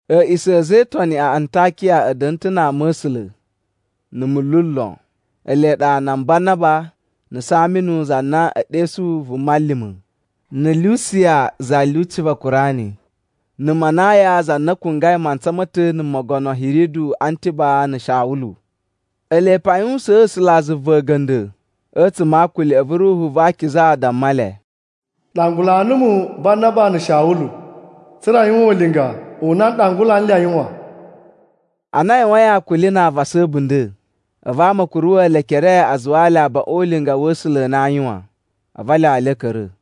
A̱a̱ꞌisa̱ a̱ a̱za̱ e Itoni a Antakiya a̱ da̱na̱ ta̱ na ama̱sula̱ na̱ munlu lon. Ele ɗa nan Banaba, na̱ Saminu za na e ɗesuyi “Vuma Lima̱,” na̱ Lusiya za lyuci va Kurani, na̱ Manayan za na kungwai mantsa ma̱ ta̱ na̱ Mogono Hiridu Antiba na̱ Shawulu. Ele pe a yuwusaan A̱sulazuva a̱ga̱nda̱ a̱tsuma̱ a akuli, a̱vu Ruhu va Akiza damma le, “Ɗangula numu Banaba na̱ Shawulu tsa̱ra̱ a yuwan ulinga u na n ɗangula nle a yuwan.” Ana a yuwain akuli na avasa a̱bunda̱, a̱vu ama a̱ kuruwa̱ le ekere a zuwaa le abaꞌun o ulinga wa̱ A̱sula̱ a na aa yuwan, a̱vu a lyawa le a̱ ka̱ra̱.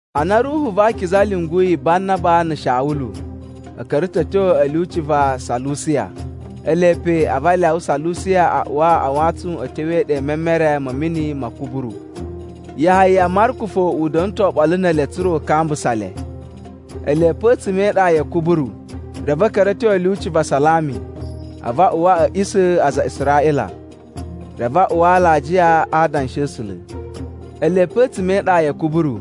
Ana Ruhu va Akiza lyunguyi Banaba na̱ Shawulu, a̱ ka̱ra̱ ta̱ a̱ tyo a̱ lyuci va Salusiya. Ele pe a̱vu a lyawa Salusiya a uwa a wantsun a̱ tyo e iɗa i memere ma̱ mini ma̱ Kuburu. Yahaya Marku fo u da̱na̱ ta̱ oɓolo ne ele tsa̱ra̱ u kambusa le. Ele pe a̱tsuma̱ e iɗa ya̱ Kuburu reve a̱ ka̱ra̱ a̱ tyo a̱ lyuci va Salami a̱vu a uwa a̱ a̱ꞌisa̱ a aza a Israꞌila, reve a uwa alajiya a adanshi a̱ A̱sula̱. Ele pe a̱tsuma̱ e iɗa ya̱ Kuburu,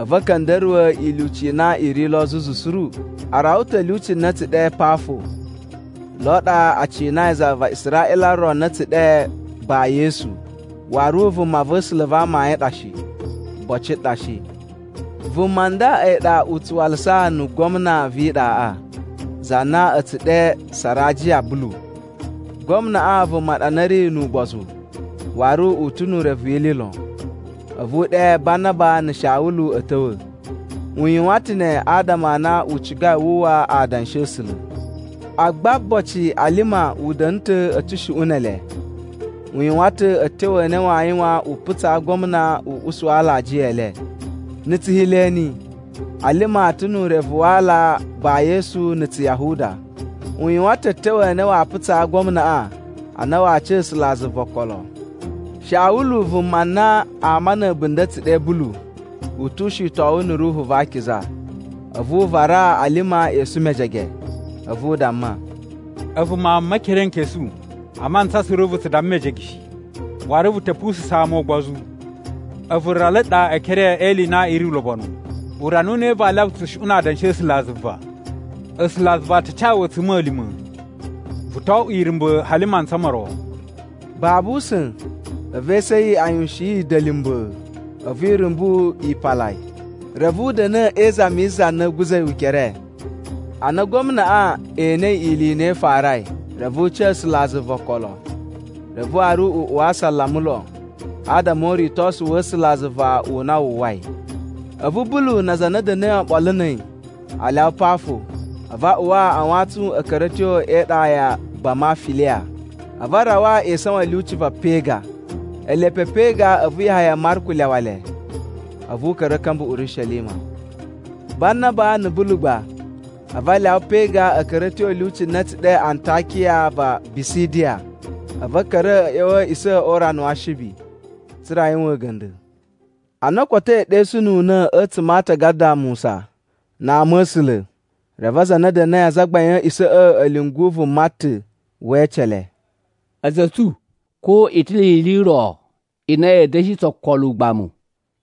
a̱vu a̱ ka̱nda̱ruwa̱ ilyuci i na i ri lo zuzu suru. A rawa ta̱ lyuci na a̱ tsu ɗe Pafo, lo ɗa a cinai za va Israꞌila ro na a̱ tsu ɗe Ba-Yesu. Waru vumava̱sula̱ va amayun ɗa shi, boci ɗa shi. Vuma nda a̱yi ɗa u tsu walasa na̱ gwamna vi iɗaꞌa, za na a̱ tsu ɗe Sarajiya Bulu. Gwamnaꞌa vuma ɗa na ri nu ugbozu waru u ta̱ nu urevu wi ili lon. A̱vu u ɗe Banaba na̱ Shawulu a̱ ta̱wa̱. U yuwan ta̱ ne adama a na u cigai wu uwwa adanshi a̱ A̱sula̱. Agba boci Alima u da̱na̱ ta̱ a̱ tsushuꞌun ne ele, u yuwan ta̱ a̱tyo a na waa yuwan u putsaa gwamna u usu alajiya e le. (Na̱ Tsuheleni Alima ta̱ nu urevu wa aala Ba-Yesu na̱ Tsuyahuda.) U yuwan ta̱ a̱tyo a na waa putsaa gwamnaꞌa a na waa ca A̱sulazuva okolo. Shawulu, vuma na ama na̱ a̱bunda̱ a̱ tsu ɗe Bulu, u tu ushitowun na̱ Ruhu va Akiza. A̱vu u varaa Alima esu mejege. A̱vu u damma, “A̱vu mawun ma̱ Mekerenkesu! A mantsa suru vu tsu damma mejege shi, waru vu ta̱ pususa̱n ama ugbozu. A̱vu rala ɗa e ekere e ili i na i ri ulobonu. Urana u ne vaa lyawa tsushuꞌun na adanshi a̱ A̱sulazuva? A̱sulazuva a ta ca wu a̱tsuma̱lima̱, vu to oꞌwo irumba̱ hali mantsa mo ro.” Babu usa̱n, a̱vu esu a̱ yi a yuwushin dalimbaa, a̱vu irumbu yi pala yi, reve u da̱na̱ e izami yi za na a̱a̱ guza̱ yi ukere. Ana gwamnaꞌa enei ili i na i farai, reve u ca A̱sulazuva okolo. Reve waru u uwa asalama lon adama o uritosu wa̱ A̱sulazuva u na wu uwwai. A̱vu Bulu na aza a na a̱ da̱na̱i oɓolo na̱ a̱yi a lyawa Pafo, a̱vu a uwa a wantsun a̱ ka̱ra̱ a̱ tyo e iɗa ya Bamafiliya. A̱vu a rawa e isawan a̱ lyuci va Pega. Ele pe Pega a̱vu Yahaya Marku lyawa le, a̱vu u ka̱ra̱ a̱ ka̱mba̱ Urishelima. Banaba na̱ Bulu gba a̱vu a lyawa Pega a̱ ka̱ra̱ a̱ tyo a̱ lyuci na a̱ tsu ɗe Antakiya va Bisidiya. A̱vu a̱ ka̱ra̱ a̱ ꞌya̱wa̱ a̱ a̱a̱ꞌisa̱ o urana wa Ashibi, tsa̱ra̱ a yuwan a̱ga̱nda̱. Ana o kotoi ɗesununa̱ a̱tsuma̱ a atagada a Musa na a ama̱sula̱, reve aza a na a̱ da̱na̱i azagbain a̱ a̱a̱ꞌisa̱ꞌa̱ a̱ lyungu vuma ta̱ we ece le, “A̱za̱ a̱ tsu, ko i ta̱ ni ili i ro i na ya̱a̱ da̱shi tsu okolo ugbamu,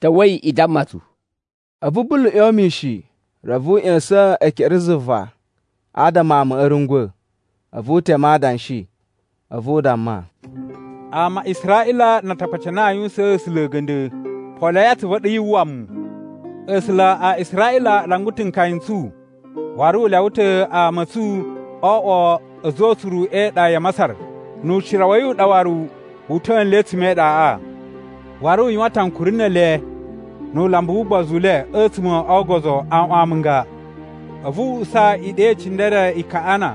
ta̱wa̱i i damma tsu!” A̱vu Bulu ꞌyon mishin reve u ꞌya̱sa̱n ekere zuva adama amaꞌa a̱ rungwa̱, a̱vu u teme adanshi. A̱vu u damma, “Ama a Israꞌila na Atakpaci a na a yuwusaan A̱sula̱ a̱ga̱nda̱, poloi atsuvu a̱ ɗu yu uwwa. A̱sula̱ a Israꞌila a ɗangula ta̱ nkaya n tsu, waru u lyawa ta̱ ama a̱ tsu o oꞌwo a̱za̱ o utsuru e iɗa ya Masar. Nu ucira wa̱ yi u ɗa waru wu uta̱a̱ nle a̱tsuma̱ e iɗaꞌa. Waru u yuwan ta̱ ankuri ne ele nu ulambu wu ugbozu u le a̱tsuma̱ o ogozo aꞌwan amunga. A̱vu u usa iɗa i cindere i Kaꞌana,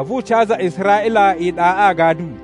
a̱vu u ca aza a Israꞌila iɗaꞌa agadu.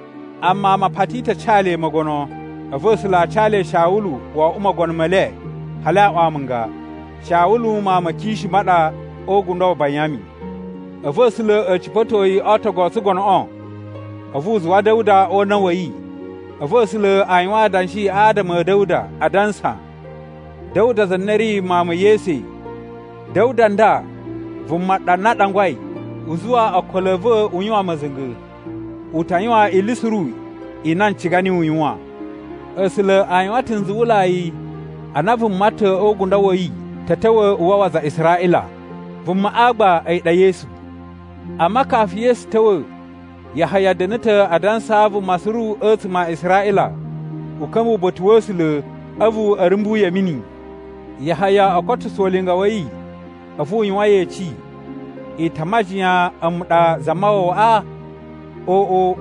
Amma ama a pati ta̱ a ca le mogono. A̱vu A̱sula̱ a ca le Shawulu wo oꞌwo mogono me le hali aꞌwan amunga. Shawulu mawun ma Kishu ma ɗa o ugundo wa Banyami. A̱vu A̱sula̱ a̱ cipa̱to yi o ootogu o tsugonoꞌo, a̱vu u zuwa Da̱wuda o una̱ wa̱ yi. A̱vu A̱sula̱ a yuwan adanshi adama a̱ Da̱wuda, adansa, ‘Da̱wuda za na ri mawun ma̱ Yese, Da̱wuda nda vuma ɗa na a ɗangulai u zuwa okolo a̱ va̱ u yuwan ma̱za̱nga̱. U ta yuwan ili suru i na n ciga niyi u yuwan.’ “A̱sula̱ a yuwan ta̱ nzuwulai a na vuma ta̱ o ugundo wa̱ yi ta̱ ta̱wa̱ u wawa aza a Israꞌila, vumaꞌa gba a̱yi ɗa Yesu. Amma kafu Yesu ta̱wa̱, Yahaya da̱na̱ ta̱ a dansaa vuma suru a̱tsuma̱ a Israꞌila u ka̱mba̱ uba̱ta̱ wa̱ A̱sula̱, a̱vu a̱ rumbu yi a̱ mini. Yahaya o kotuso ulinga wa̱ yi, a̱vu u yuwan yeci, ‘I ta a majiyan a̱mu ɗa Zamawawaꞌa? Oꞌo!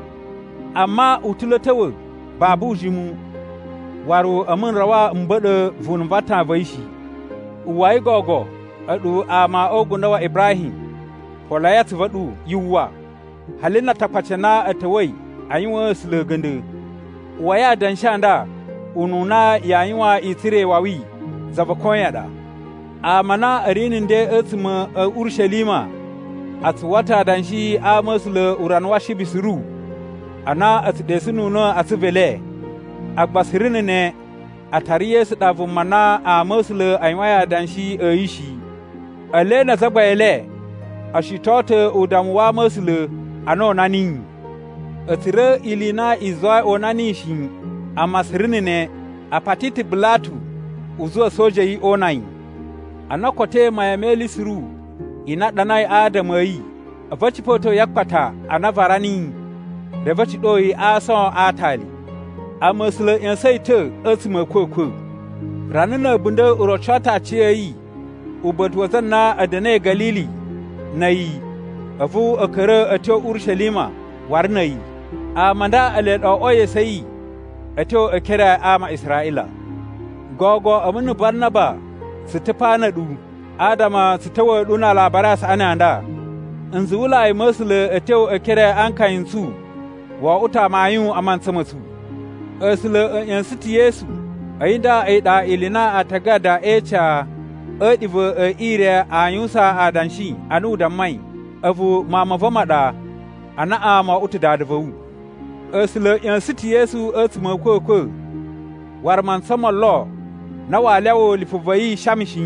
Amma u ta̱ lo a̱ ta̱wa̱ babu ujimu. Waru a̱mu n rawa m ba̱ɗa̱ vunu va atan va̱ yi shi.’ “Uwwai gogo, a̱ɗu ama o ugundo wa Ibrahim! Poloi atsuvu a̱ ɗu yu uwwa, hali na Atakpaci a na a̱ ta̱wa̱i a yuwaan A̱sula̱ a̱ga̱nda̱! Uwwai adanshi a nda ununa yaa yuwan i tsura̱ iwawi, za va koyan ɗa. Ama a na a̱ ri na̱ nden a̱tsuma̱ a̱ Urishelima a tsu uwwa ta̱ adanshi a ama̱sula̱ urana wa Ashibi suru a na a̱ tsu ɗesununa̱ a atsuvu e le. Agba suru na̱ ne, a tara Yesu ɗa vuma na ama̱sula̱ a yuwain adanshi a̱ yi shi. Ele na azagbain e le o shiton ta̱ udammu wa ama̱sula̱ ana o una niyi. A̱ tsura̱ ili i na i zuwai o una niyi shi, amma suru na̱ ne, a pati ta̱ Bilatu u zuwa a̱soja a̱ yi o una yi. “Ana o kotoi mayan me ili suru i na a ɗanai adama a̱ yi, a̱vu a̱ cipa̱to yi a akpata a na a vara niyi, reve a̱ ciɗo yi a aason a aatali. Amma A̱sula̱ a̱ ꞌya̱sa̱n yi ta̱ a̱tsuma̱ a̱ a̱kwa̱kwa̱. Rana na̱ a̱bunda̱ u roco ta̱ aciya̱yi uba̱ta̱ wa aza a na a̱ da̱na̱i Ga̱lili na̱ a̱yi a̱vu a̱ ka̱ra̱ a̱ tyo Urishelima waru na̱ a̱yi. Ama a nda ele ɗa o oꞌwoi esu a̱ yi a̱ tyo e ekere a ama a Israꞌila. “Gogo a̱mu na̱ Banaba tsu ta̱ pa na̱ a̱ɗu, adama tsu ta̱wa̱a̱ ɗu na Alabari a Saꞌani a nda. Nzuwulai ma̱ A̱sula̱ a̱ tyo e ekere a nkaya n tsu wo oꞌwo ta̱ amayun a mantsa ma̱ tsu. A̱sula̱ a̱ ꞌya̱sa̱n ta̱ Yesu. A̱yi nda a̱yi ɗa ili i na Aatagada e Ica a̱ a̱a̱ɗiva̱ e ire aa yuwusan adanshi ana u dammai, ‘A̱vu Mawun ma̱ va̱ ma ɗa. Anaꞌan mo oꞌwo ta̱ Dada va̱ wu.’ “A̱sula̱ a̱ ꞌya̱sa̱n ta̱ Yesu a̱tsuma̱ a̱ a̱kwa̱kwa̱, waru mantsa mo lo na waa lyawa lipu va̱ yi shama shi.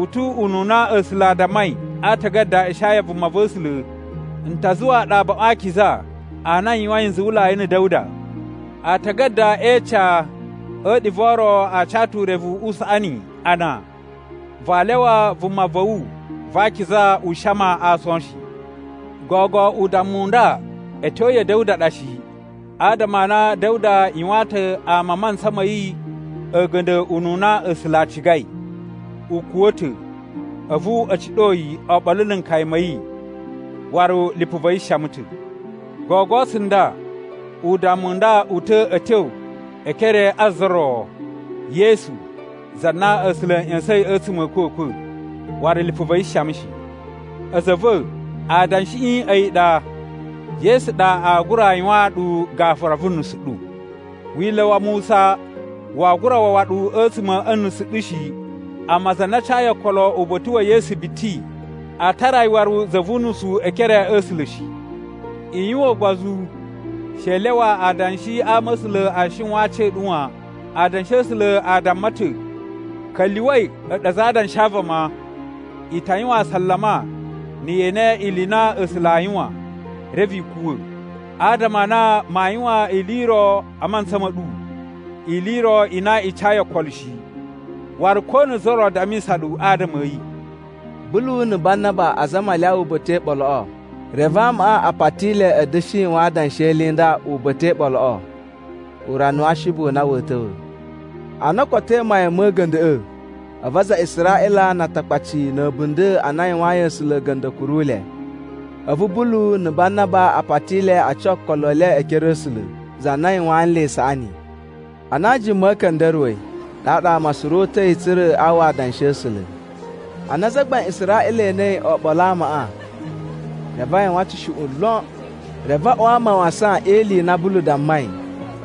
U tu ununa A̱sula̱ a dammai a Aatagada a Ishaya vumava̱sula̱, ‘N ta zuwaa ɗu abaꞌun a akiza a na n yuwain nzuwulai na̱ Da̱wuda.’ “Aatagada e Ica a̱ a̱a̱ɗiva̱ o ro a ca ta̱ urevu u saꞌani, a na, ‘Vaa lyawa Vuma va̱ wu va akiza u shama a aason shi.’ “Gogo udammu u nda a̱ tyo ya̱ Da̱wuda ɗa shi, adama a na Da̱wuda yuwaan ta̱ ama a mantsa ma̱ yi a̱ga̱nda̱ ununa A̱sula̱ a cigai. U kuwa̱ ta̱, a̱vu a̱ ciɗo yi oɓolo na̱ nkaya ma̱ yi, waru lipu va̱ yi shama ta̱. Gogo tsunda udammu u nda u ta̱ a̱ tyo e ekere a za ro, Yesu, za na A̱sula̱ a̱ ꞌya̱sa̱in a̱tsuma̱ a̱ a̱kwa̱kwa̱, waru lipu va̱ yi shama shi. “A̱za̱ a̱ va̱, adanshiꞌi a̱yi ɗa, Yesu ɗa aa gura yuwaan ɗu gafura vu nusu ɗu! Wila̱ wa Musa waa gura wawa ɗu a̱tsuma̱ a̱ nusu ɗu shi. Amma za na cayi okolo uba̱ta̱ wa̱ Yesu biti, a tara yi waru za vu unusu e ekere a̱ A̱sula̱ shi. “I yuwan ugbozu! She i lyawa adanshi a ama̱sula̱ a shiwan a aci a̱ ɗu wan. Adanshi a̱ A̱sula̱ a damma ta̱, ‘Ka̱lyuwa̱i a̱ɗu aza a adanshi a vama, i ta yuwan asalama na̱ ye ene ili i na A̱sula̱ aa yuwan, reve i kuwa̱! Adama a na maa yuwan ili i ro a mantsa ma̱ ɗu, ili i ro i na i cayi okolo shi, waru ko na̱ za ro dammisa ɗu adama a̱ yi.’” Bulu na̱ Banaba azama a lyawa uba̱ta̱ e iɓoloꞌo, reve amaꞌa a pati le a̱ da̱shi yuwan adanshi e ili i nda uba̱ta̱ e iɓoloꞌo urana wa Ashibi u na wa̱a̱ ta̱wa̱. Ana o kotoi mayan ma̱ a̱ga̱nda̱ꞌa̱, a̱vu aza a Israꞌila na Atakpaci na̱ a̱bunda̱ a na a yuwayin A̱sula̱ a̱ga̱nda̱ a̱ kuru le. A̱vu Bulu na̱ Banaba a pati le a ca okolo e le e ekere a̱ A̱sula̱, za na yuwaan nle isaꞌani. Ana ajuma a̱ ka̱nda̱ruwa̱i, ɗaɗa ama suru o uta̱i tsa̱ra̱ a uwwa adanshi a̱ A̱sula̱. Ana azagbain a Israꞌila e enei oɓolo a amaꞌa, reve a yuwan tsushuꞌun lon, reve a uwa mawasan e ili i na Bulu dammai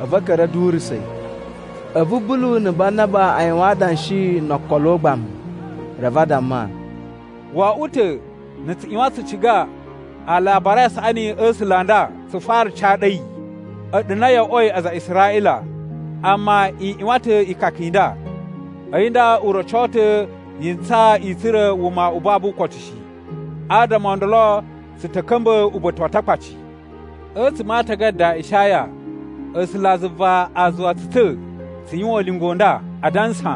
a̱vu a̱ ka̱ra̱ a̱ durusa̱ yi. A̱vu Bulu na̱ Banaba a yuwan adanshi no okolo ugbamu reve a damma, “Wo oꞌwo ta̱ na̱ tsu ꞌyuwan tsu ciga Alabari a Saꞌani a̱ A̱sula̱ a nda tsu fara ca ɗu a̱yi, a̱ɗu na yo oꞌwoi aza a Israꞌila. Amma i ꞌyuwan ta̱ ikaka i nda, a̱yi nda u roco ta̱ yi ntsaa i tsura̱ wuma u babu ukotu shi. Adama o ndolo tsu ta̱ ka̱mba̱ uba̱ta̱ wa Atakpaci. “A̱tsuma̱ a Aatagada a Ishaya, A̱sulazuva a zuwa tsu ta̱ tsu yuwan ulinga u nda, adansa,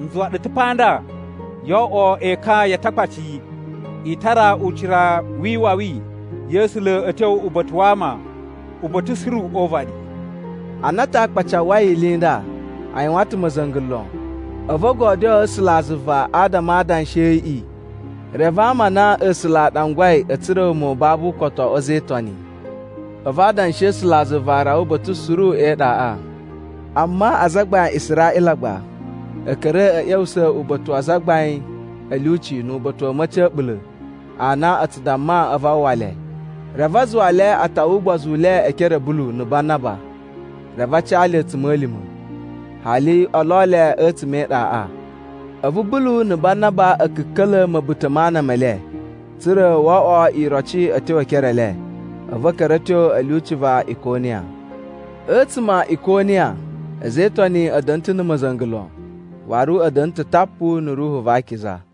‘N zuwa ɗu ta̱ pa nda yoo oꞌwo ekan ya Atakpaci. I tara ucira wi iwawi ya̱ A̱sula̱ a̱ tyo uba̱ta̱ wa ama, uba̱ta̱ suru o uvaɗi.’” Ana Atakpaci a uwwai ili i nda, a yuwan ta̱ ma̱za̱nga̱ lon, a̱vu o godyoo A̱sulazuva adama a adanshi a̱ yiꞌi. Reve ama a na A̱sula̱ a ɗangulai a̱ tsura̱ wuma u babu ukotu o oꞌwo a̱za̱ e Itoni. A̱vu adanshi a̱ A̱sulazuva a rawa uba̱ta̱ suru e iɗaꞌa. Amma azagbain a Israꞌila gba a̱ ka̱ra̱ a̱ ꞌya̱wusa̱ uba̱ta̱ wa azagbain a̱ lyuci nu uba̱ta̱ wa̱ a̱ma̱ci a̱ a̱ɓula̱ a na a tsu damma a̱vu a uwwa le. Reve a zuwa le a tawa ugbozu u le e ekere a̱ Bulu na̱ Banaba, reve a ca le a̱tsuma̱lima̱, hali o lo le a̱tsuma̱ e iɗaꞌa. A̱vu Bulu na̱ Banaba a̱ ka̱ka̱la̱ ma̱buta̱ ma ana me le, tsa̱ra̱ wo oꞌwo iroci a̱ tyo e ekere e le. A̱vu a̱ ka̱ra̱ a̱ tyo a̱ lyuci va Ikoniya. A̱tsuma̱ a Ikoniya a̱za̱ e Itoni a̱ da̱na̱ ta̱ na̱ ma̱za̱nga̱ lon, waru a̱ da̱na̱ ta̱ tapu na̱ Ruhu va Akiza.